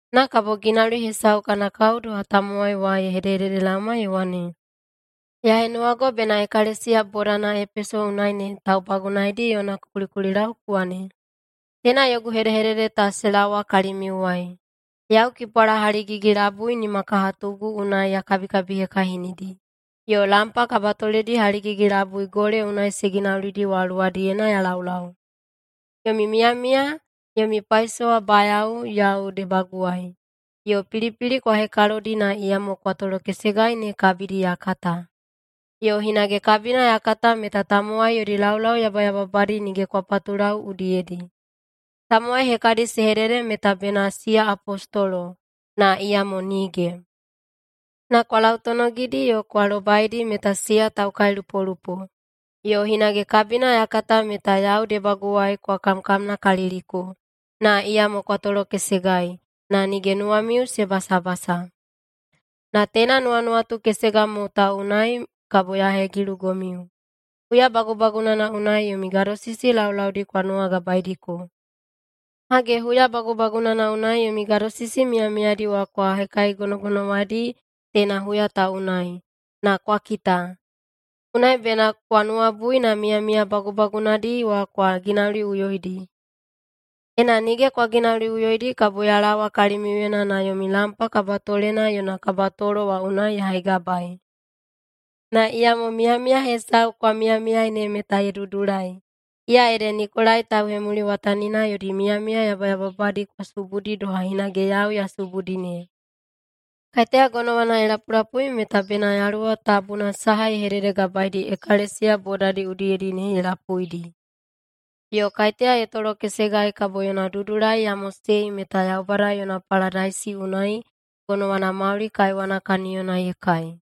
Na kabo ginauli hesau kana kao doha tamowai wa ye hededelaoma ye wane, “Ya henuwago bena ekalesiya bodana Epeso unai ne taubagunaedi yona ku kulikulilau ku wane, Teina yogu hedehedede ta se laowa kalimiuwai. Yau kipwala haligigi-labui nimakahatugu unai ya kabikabihekahinidi, yo lampa kabatoledi haligigi-labui gole unai se ginaulidi wa luwadiyena ya laulau. Yomi miyamiya, yomi paisowabayao yau debaguwai, yo pilipili kwa hekalodi na iyamo kwa tolokesegai ne kabidi ya kata. Yo hinage kabina ya kata meta tamowai yodi laulau yabayababadi nige kwa patulau udiyedi. Tamowai hekadi se hedede meta bena siya apostolo, na iyamo nige. Na kwa lautonogidi yo kwa lobaidi meta siya taukailupolupo. Yo hinage kabina ya kata meta yau debaguwai kwa kamkamnakaliliko, na iyamo kwa tolokesegai, na nige nuwamiu se basabasa. Na teina nuwanuwatu kesega mo ta unai kabo ya hegilugomiu: Huya bagubagunana unai yomi gadosisi laulaudi kwa nuwagabaediko. Hage, huya bagubagunana unai yomi gadosisi miyamiyadi wa kwa hekaigonogonowaiyedi teina huya ta unai, na kwa kita! Unai bena kwa nuwabui na miyamiya bagubagunadi wa kwa ginauliꞌuyoidi. Ena nige kwa ginauliꞌuyoidi kabo ya laowa kalimiuyena na yomi lampa kabatolena yona kabatolo wa unai ya haigabaei. Na iyamo miyamiya hesau kwa miyamiyai ne meta ye dudulai. Iya ede Nikolai tauhemuliwatanina yodi miyamiya yabayababadi kwa subudi doha hinage yau ya subudi ne. Kaiteya gonowana ye lapulapui meta bena Yaluwa Tabuna saha ye hededegabaedi ekalesiya bodadi udiyedi ne ye lapuidi. Yo kaiteya ye tolokesegai kabo yona dudulai ya mosei meta Yaubada yona paladaisi unai gonowana mauli kaiwana kaniyona ye kai.”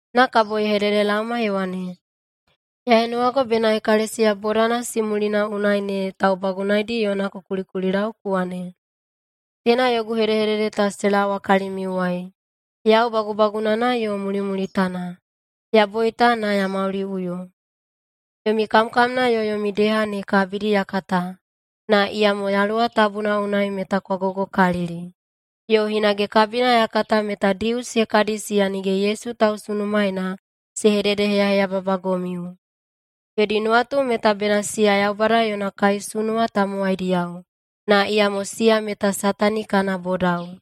Na kabo ye hededelaoma ye wane, “Ya henuwago bena ekalesiya bodana Simulina unai ne taubagunaedi yona ku kulikulilau ku wane, Teina yogu hedehedede ta se laowa kalimiuwai. Yau Bagubagunana yo Mulimulitana. Ya boita, na ya mauliꞌuyo. Yomi kamkamna yo yomi deha ne kabidi ya kata, na iyamo Yaluwa Tabuna unai meta kwa gogokalili. Yo hinage kabina ya kata meta Dius hekadi siya nige Yesu tausunumaena se hededeheyaheyababagomiu. Yodi nuwatu meta bena siya Yaubada yona kaisunuwa tamowaidiyao, na iyamo siya meta Satani kana bodao.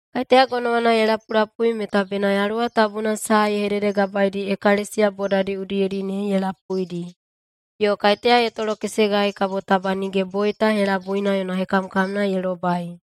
Kaiteya gonowana ye lapulapui meta bena Yaluwa Tabuna saha ye hededegabaedi ekalesiya bodadi udiyedi ne ye lapuidi. Yo kaiteya ye tolokesegai kabo taba nige boita helabuina yona hekamkamna ye lobai.”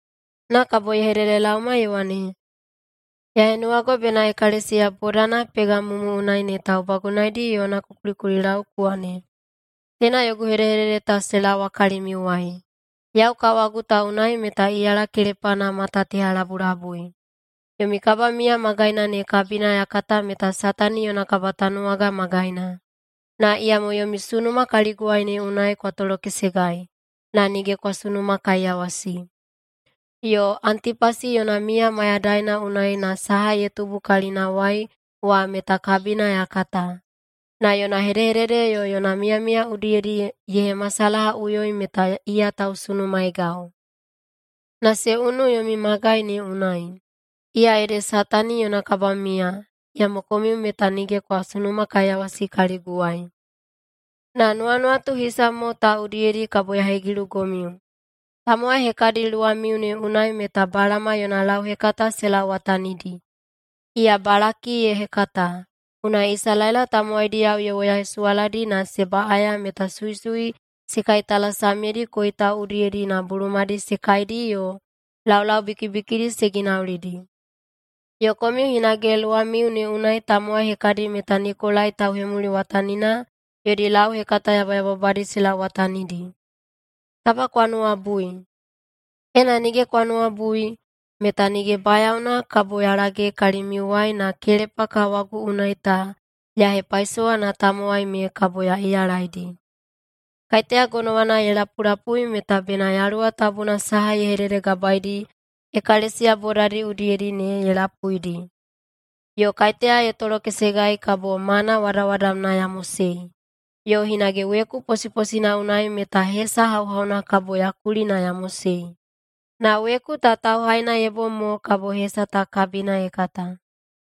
Na kabo ye hededelaoma ye wane, “Ya henuwago bena ekalesiya bodana Pegamumu unai ne taubagunaedi yona ku kulikulilau ku wane, Teina yogu hedehedede ta se laowa kalimiuwai. Yau kawagu ta unai meta iyala kelepana mata teha labulabui. Yomi kabamiya magaina ne kabina ya kata meta Satani yona kabatanuwaga magaina. Na iyamo yomi sunuma kaliguwai ne unai kwa tolokesegai, na nige kwa sunumakaiyawasi. Yo Antipasi yona miya mayadaina unai na saha ye tubu kalinawai wa meta kabina ya kata. Na yona hedehedede yo yona miyamiya udiyedi ye hemasalahaꞌuyoi meta iya tausunumaegau. Na se unui yomi magai ne unai, iya ede Satani yona kabamiya, iyamo komiu meta nige kwa sunumakaiyawasi kaliguwai. Na nuwanuwatu hisa mo ta udiyedi kabo ya hegilugomiu: Tamowai hekadi luwamiu ne unai meta Balama yona lauhekata se lauwatanidi. Iya Balaki ye hekata, unai Isalaela tamowaidiyao ye woyahesuwaladi na se baꞌaya meta suisui se kaitalasamyedi koitau udiyedi na bulumadi se kaidi yo laulau bikibikidi se ginaulidi. Yo komiu hinage luwamiu ne unai tamowai hekadi meta Nikolai tauhemuliwatanina yodi lauhekata yabayababadi se lauwatanidi. Taba kwa nuwabui! Ena nige kwa nuwabui, meta nige bayaona kabo ya lage kalimiuwai na kelepa kawagu unai ta ya hepaisowa na tamowai me kabo ya iyalaidi. Kaiteya gonowana ye lapulapui meta bena Yaluwa Tabuna saha ye hededegabaedi ekalesiya bodadi udiyedi ne ye lapuidi. Yo kaiteya ye tolokesegai kabo mana wadawadamna ya mosei. Yo hinage weku posiposina unai meta hesa hauhauna kabo ya kuli na ya mosei. Na weku ta tauhaina ye bom mo kabo hesa ta kabina ye kata.”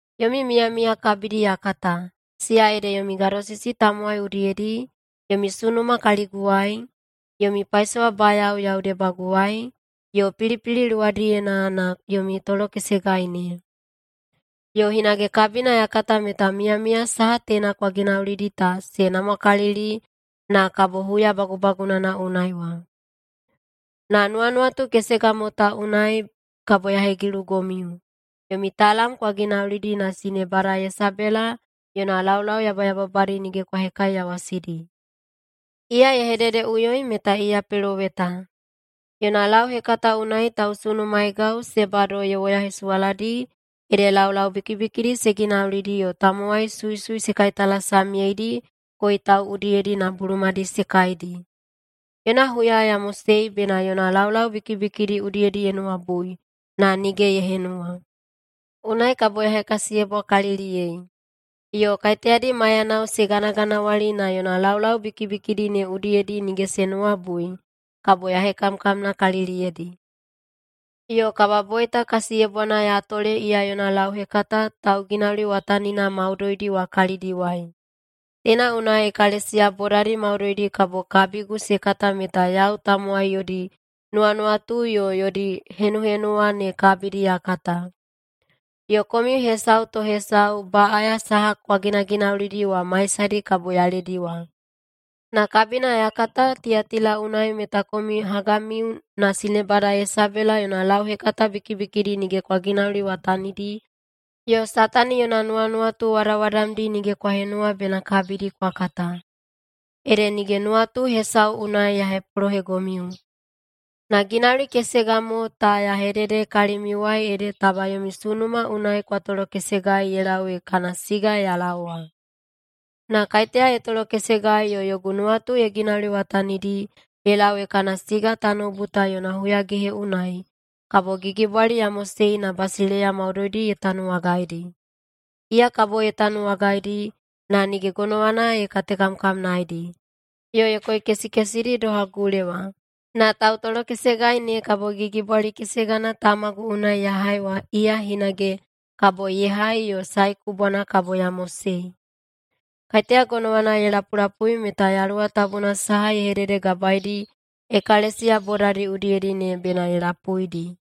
Yomi miyamiya kabidi ya kata, siya ede yomi gadosisi tamowai udiyedi, yomi sunuma kaliguwai, yomi paisowabayao yau debaguwai, yo pilipili luwadiyena na yomi tolokesegai ne. Yo hinage kabina ya kata meta miyamiya saha teina kwa ginaulidi ta se namwakalili na kabo huya bagubagunana unai wa. Na nuwanuwatu kesega mo ta unai kabo ya hegilugomiu: Yomi talam kwa ginaulidi na sinebada Yesebela yona laulau yabayababadi nige kwa hekaiyawasidi. Iya ye hededeꞌuyoi meta iya peloweta. Yona lauhekata unai tausunumaegau se bado ye woyahesuwaladi ede laulau bikibikidi se ginaulidi yo tamowai suisui se kaitalasamyeidi koitau udiyedi na bulumadi se kaidi. Yona huya ya mosei bena yona laulau bikibikidi udiyedi ye nuwabui, na nige ye henuwa. Unai kabo ya hekasiyebwakaliliyei. Yo kaiteyadi maiyanao se ganaganawali na yona laulau bikibikidi ne udiyedi nige se nuwabui, kabo ya hekamkamnakaliliyedi. Yo kababoita kasiyebwana ya tole iya yona lauhekata tauginauliwatanina maudoidi wa kalidiwai. Teina unai ekalesiya bodadi maudoidi kabo kabigu se kata meta yau tamowai yodi nuwanuwatu yo yodi henuhenuwa ne kabidi ya kata. Yo komiu hesau to hesau baꞌaya saha kwa ginaginaulidi wa maisadi kabo ya lediwa. Na kabina ya kata Tiyatila unai meta komiu hagamiu na sinebada Yesebela yona lauhekata bikibikidi nige kwa ginauliwatanidi yo Satani yona nuwanuwatu wadawadamdi nige kwa henuwa bena kabidi kwa kata. Ede nige nuwatu hesau unai ya hepolohegomiu, na ginauli kesega mo ta ya hedede kalimiuwai ede taba yomi sunuma unai kwa tolokesegai ye lau ee kana siga ya laowa. Na kaiteya ye tolokesegai yo yogu nuwatu ye ginauliwatanidi ye lau ee kana siga tanoubu ta yona huyagehe unai, kabo gigibwali ya mosei na basileiya maudoidi ye tanuwagaidi. Iya kabo ye tanuwagaidi, na nige gonowana ye katekamkamnaedi, yo ye koikesikesidi doha gulewa. Na tautolokesegai ne kabo gigibwali kesegana Tamagu unai ya hai wa, iya hinage kabo ye hai yo Sae Kubwana kabo ya mosei. Kaiteya gonowana ye lapulapui meta Yaluwa Tabuna saha ye hededegabaedi ekalesiya bodadi udiyedi ne bena ye lapuidi.”